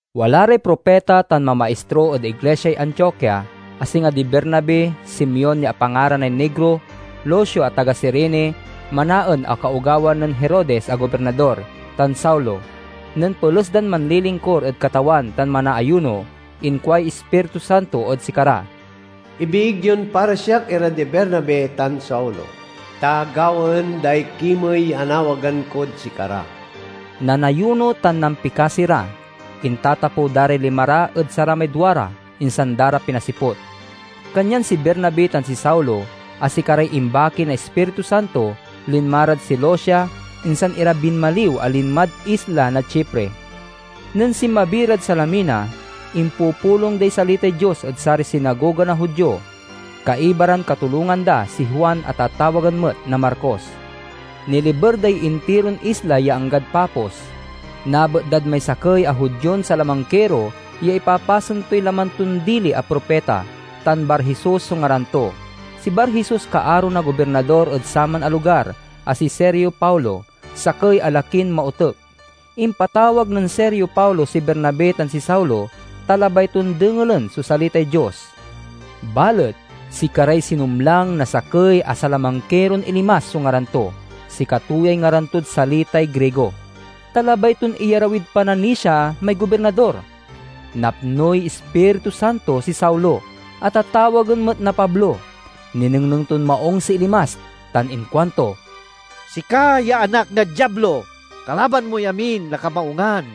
Wala ray propita tan mamaistro ed iglisiay Antiokia, a singa di Bernabe, Simeon ya apangaranay Negro, Lucio a taga Cirene, Manaen a kaogawan nen Herodes a gobirnador, tan Saulo. Nen peles dan manlilingkur ed Katawan tan manaayuno, inkuay Ispiritu Santo ed sikara, "Ibiig yon para siak ira di Bernabe tan Saulo, ta gawaen day kimey ya anawagan kod sikara." Nanayuno tan nampikasi ra, intatapew da ray lima ra ed saramay duara, insan da ra pinasiput. Kanyan si Bernabe tan si Saulo, a sikaray imbaki na Ispiritu Santo, linma rad Seleucia, insan ira binmaliw a linmad isla na Chipre. Nen sinmabi ran Salamina, impupulong day salitay Dios ed saray sinagoga na Judio. Kaiba ran katulongan da si Juan a tatawagen met na Marcos. Niliber day intiron isla ya anggad Pafos. Nabet dad may sakey a Judion salamangkiro ya ipapasen toy laman ton dili a propita, tan Bar-Jesus so ngaran to. Si Bar-Jesus kaaro na gobirnador ed saman a lugar a si Sergio Paulo, sakey a lakin maotek. Impatawag nen Sergio Paulo si Bernabe tan si Saulo, ta labay ton dengelen so salitay Dios. Balet sikaray sinumlang na sakey a salamangkiron Elimas so ngaran to (sikato yay ngaran tod salitay Grigo), ta labay ton iyarawid pananisia may gobirnador. Napnoy Ispiritu Santo si Saulo, a tatawagen met na Pablo. Ninengneng ton maung si Elimas, tan inkuanto, "Sika ya anak na Diablo! Kalaban moy amin a kamaungan,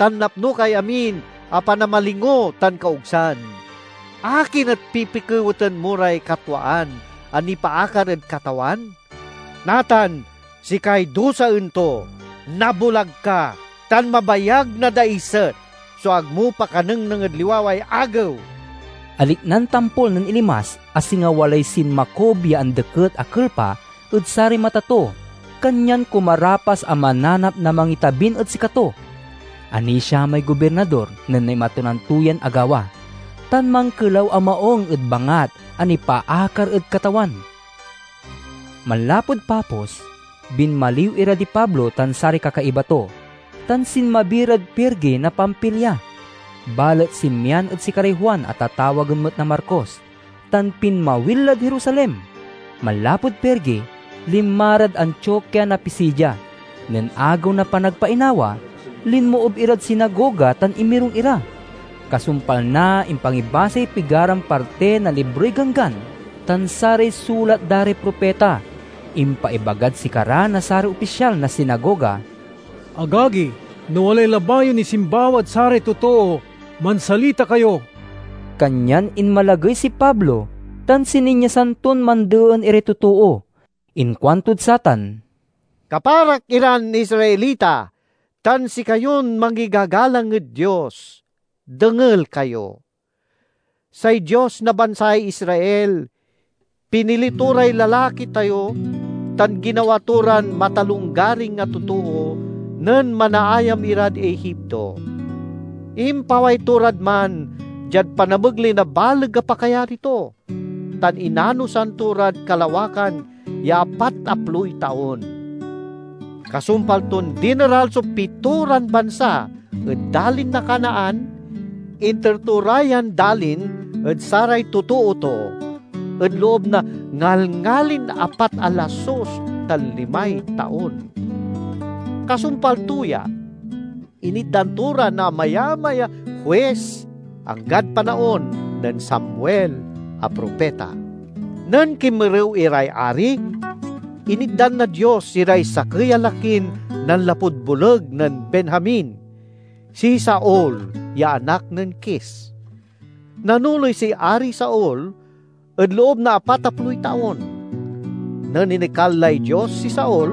tan napno kay amin a panamalingo tan kaogsan! Akin et pipikeweten mo ray katwaan a nipaakar ed Katawan? Natan, sikay duasen to. Nabulag ka, tan mabayag na daiset so ag mo pakanengneng ed liwaway agew!" Aliknan tampol nen Elimas a singa walay sinmakub ya andeket a kelpa ed saray mata to, kanyan kumarapas a mananap na mangitabin ed sikato. Anisia may gobirnador nen naimatonan to yan agawa, tan mankelaw a maung ed bangat a nipaakar ed Katawan. Manlapud Pafos, binmaliw ira di Pablo tan saray kakaiba to, tan sinmabi rad Perge na Pamfilia. Balet sinmian ed sikaray Juan a tatawagen met na Marcos tan pinmawil lad Jerusalem. Manlapud Perge linma rad Antiokia na Pisidia. Nen Agew na Panagpainawa, linmoob irad sinagoga tan inmirung ira. Kasumpal na impangibasay pigaran parti na Libroy Ganggan tan saray sulat da ray propita, impaibagad sikara na saray opisyal na sinagoga: "Agagi, no walay labay yon isimbawa ed saray totoo, mansalita kayo!" Kanyan inmalagey si Pablo tan sininyasan ton mandeen iray totoo. Inkuantod satan: "Kaparak iran Israelita tan sikayon mangigagalang ed Dios, dengel kayo! Say Dios na bansay Israel pinili to ray lalaki tayo tan ginawa to ran matalonggaring a totoo nen manaayam irad Egipto. Impaway to rad man diad panamegley na baleg a pakayari to, tan inanosan to rad kalawakan ya apataploy taon. Kasumpal ton dineral so pitoran bansa ed dalin na Canaan, inter to ra yan dalin ed saray totoo to ed loob na ngalngalin apat a lasus tan limay taon. "Kasumpal to ya, initdan to ra na amayamay a huis, anggad panaon nen Samuel a propita. Nen kinmerew iray ari, initdan na Dios iray sakey a lakin nanlapud boleg nen Benjamin—si Saul ya anak nen Kis. Nanoley si Ari Saul ed loob na apataploy taon. Nen inekal lay Dios si Saul,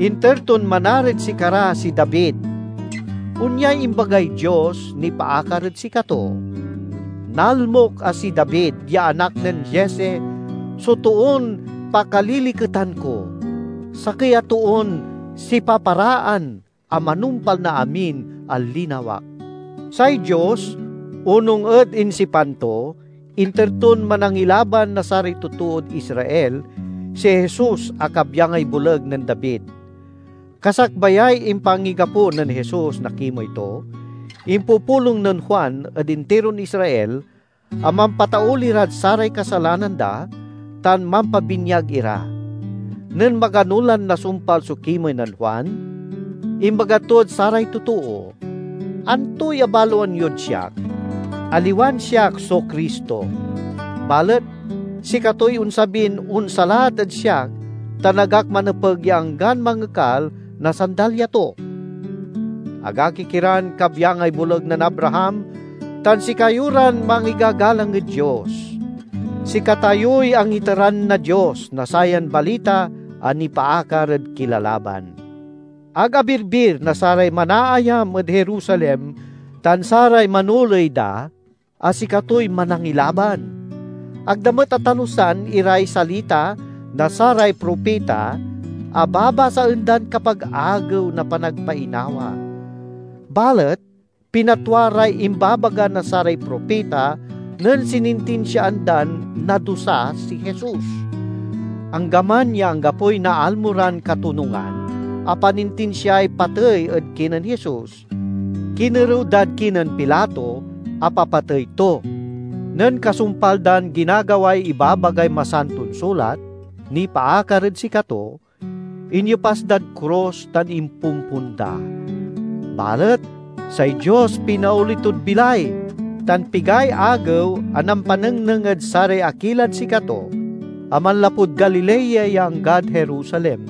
inter ton manarid sikara si David. Onyay imbagay Dios nipaakar ed sikato: 'Nalmok a si David ya anak nen Jesse so toon pakaliliketan ko, sakey a toon sipaparaan a manumpal na amin a linawak.' Say Dios, onung ed insipan to, inter ton Manangilaban na saray totood Israel si Jesus a kabyangay boleg nen David. Kasakbayay impangigapo nen Jesus na kimey to, impupulong nen Juan ed intiron Israel a mampatauli rad saray kasalanan da tan mampabinyag ira. Nen magano lan nasumpal so kimey nen Juan, imbaga tod saray totoo, 'Antoy abaloan yod siak? Aliwan siak so Cristo, balet sikatoy onsabin onsalat ed siak tan ag ak manepeg ya anggan mangekal na sandalya to.' "Agagik iran kabyangay boleg nen Abraham tan sikayo ran mangigagalang ed Dios: sikatayoy angiteran na Dios na sayan balita a nipaakar ed kilalaban! Ag abirbir na saray manaayam ed Jerusalem tan saray manoley da a sikatoy Manangilaban. Ag da met atalusan iray salita na saray propita, a babasaen dan kapag Agew na Panagpainawa. Balet pinatwa ray imbabaga na saray propita nen sinintinsiaan dan nadusa si Jesus. Anggaman ya anggapoy naalmo ran katonungan a panintinsiay patey ed kinen Jesus, kinerew dad kinen Pilato a papatey to. Nen kasumpal dan ginagaway ibabagay Masanton Sulat nipaakar ed sikato, inyepas dad krus tan impompon da. Balet say Dios pinaoli tod bilay, tan pigay agew a nampanengneng ed saray akilad sikato a manlapud Galilea ya anggad Jerusalem.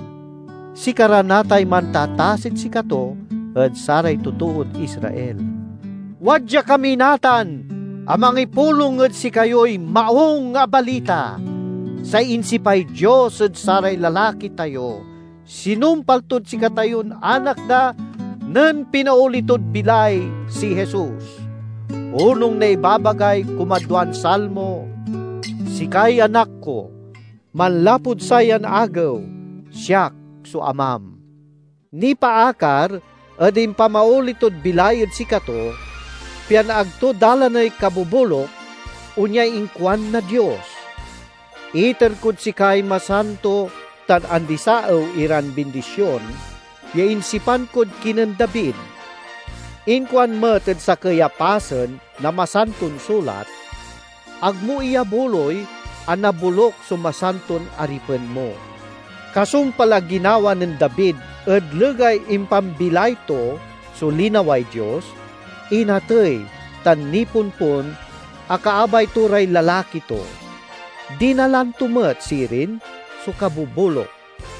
Sikara natay mantatasid sikato ed saray totood Israel. Wadya kami natan a mangipulong ed sikayoy Maung a Balita: say insipay Dios ed saray lalaki tayo sinumpal tod sikatayon anak da, nen pinaoli tod bilay si Jesus. Onung na ibabagay kumadwan Salmo: 'Sikay Anak ko; manlapud sayan agew, siak so Amam.' Nipaakar ed impamaoli tod bilay ed sikato, pian ag to dalaney kaboboluk, onyay inkuan na Dios: 'Iter kod sikay masanto tan andisaew iran bindision ya insipan kod kinen David.' Inkuan met ed sakey a pasen na Masanton Sulat, 'Ag mo iyabuloy a naboluk so masanton aripen mo.' Kasumpal a ginawa nen David ed legay impambilay to so linaway Dios, inatey tan nipompon a kaabay to ray lalaki to. Dinalan to met sirin so kaboboluk.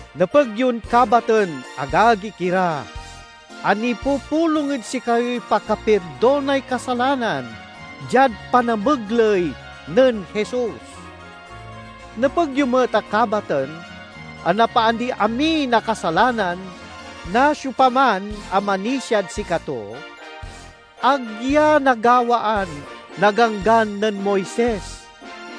Nepeg yon kabaten, agagik ira, a nipupulong ed sikayoy pakapirdonay kasalanan, diad panamegley nen Jesus. Nepeg yo met a kabaten a napaandiy amin a kasalanan na siopaman a manisiad sikato; ag ya nagawaan na Ganggan nen Moises.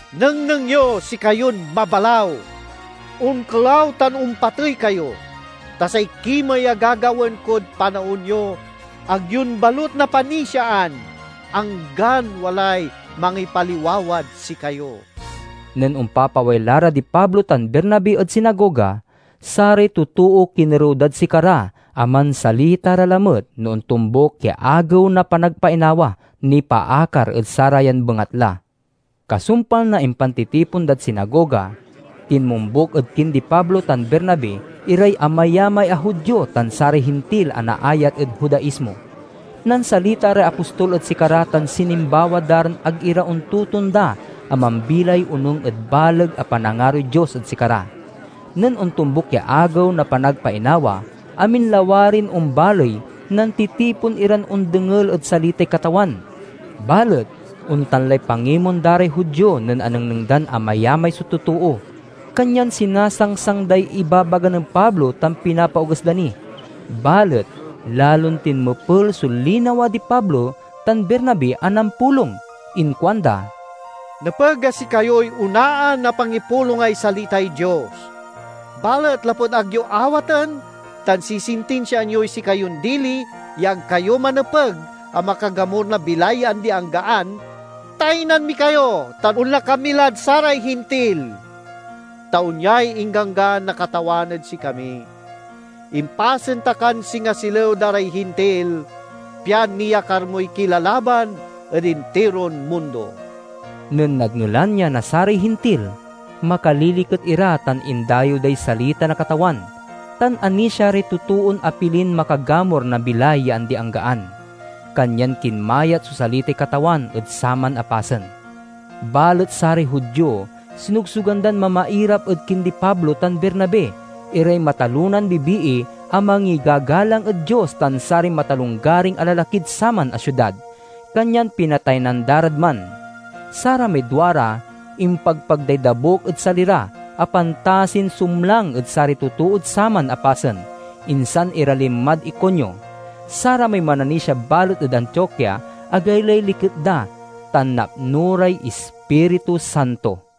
'Nengneng yo, sikayon mabalaw! Onkelaw tan ompatey kayo! Ta say kimey a gagawaen kod panaon yo et ag yon balut napanisiaan, anggan walay mangipaliwawad sikayo!'" Nen ompapaway la ra di Pablo tan Bernabe ed sinagoga, saray totoo kinerew dad sikara a mansalita ra lamet no ontombuk ya Agew na Panagpainawa nipaakar ed sarayan bengatla. Kasumpal na impantitipon dad sinagoga, tinmombuk ed kindi Pablo tan Bernabe iray amayamay a Judio tan saray Hintil a naayat ed Judaismo. Nansalita ray apostol ed sikara tan sinimbawa da ran ag ira ontotonda a mambilay onung ed baleg a panangaroy Dios ed sikara. Nen ontombuk ya Agew na Panagpainawa, amin lawarin ombaley nantitipon iran ondengel ed salitay Katawan. Balet ontan lay pangimon da ray Judio nen anengneng dan amayamay so totoo, kanyan sinasangsang day ibabaga nen Pablo tan pinapaoges da ni. Balet lalon tinmepel so linawa di Pablo tan Bernabe a nampulong. Inkuanda, "Nepeg a sikayoy onaan a pangipulongay salitay Dios. Balet lapud ag yo awaten, tan sisintinsiaan yoy sikayon dili ya ag kayo manepeg a makagamur na bilay ya andi-anggaan, taynan mi kayo tan onla kami lad saray Hintil. Ta onyay ingganggan na Katawan ed sikami: 'Impasen ta kan singa silew da ray Hintil, pian niyakar moy kilalaban ed intiron mundo.'" Nen nadngelan ya na saray Hintil, makaliliket ira tan indayew day salita na Katawan; tan anisia ray totoon apilin makagamur na bilay ya andi-anggaan. Kanyan kinmayat so salitay Katawan ed saman a pasen. Balet saray Judio sinogsogan dan mamairap ed kindi Pablo tan Bernabe iray matalonan bibii a mangigagalang ed Dios tan saray matalonggaring a lalakid saman a siudad, kanyan pinataynan da rad man. Saramay duara impagpag day dabuk ed sali ra a pantasin sumlang ed saray totood saman a pasen, insan ira linmad Iconio. Saramay mananisia balet ed Antiokia agaylay liket da tan napno ray Ispiritu Santo.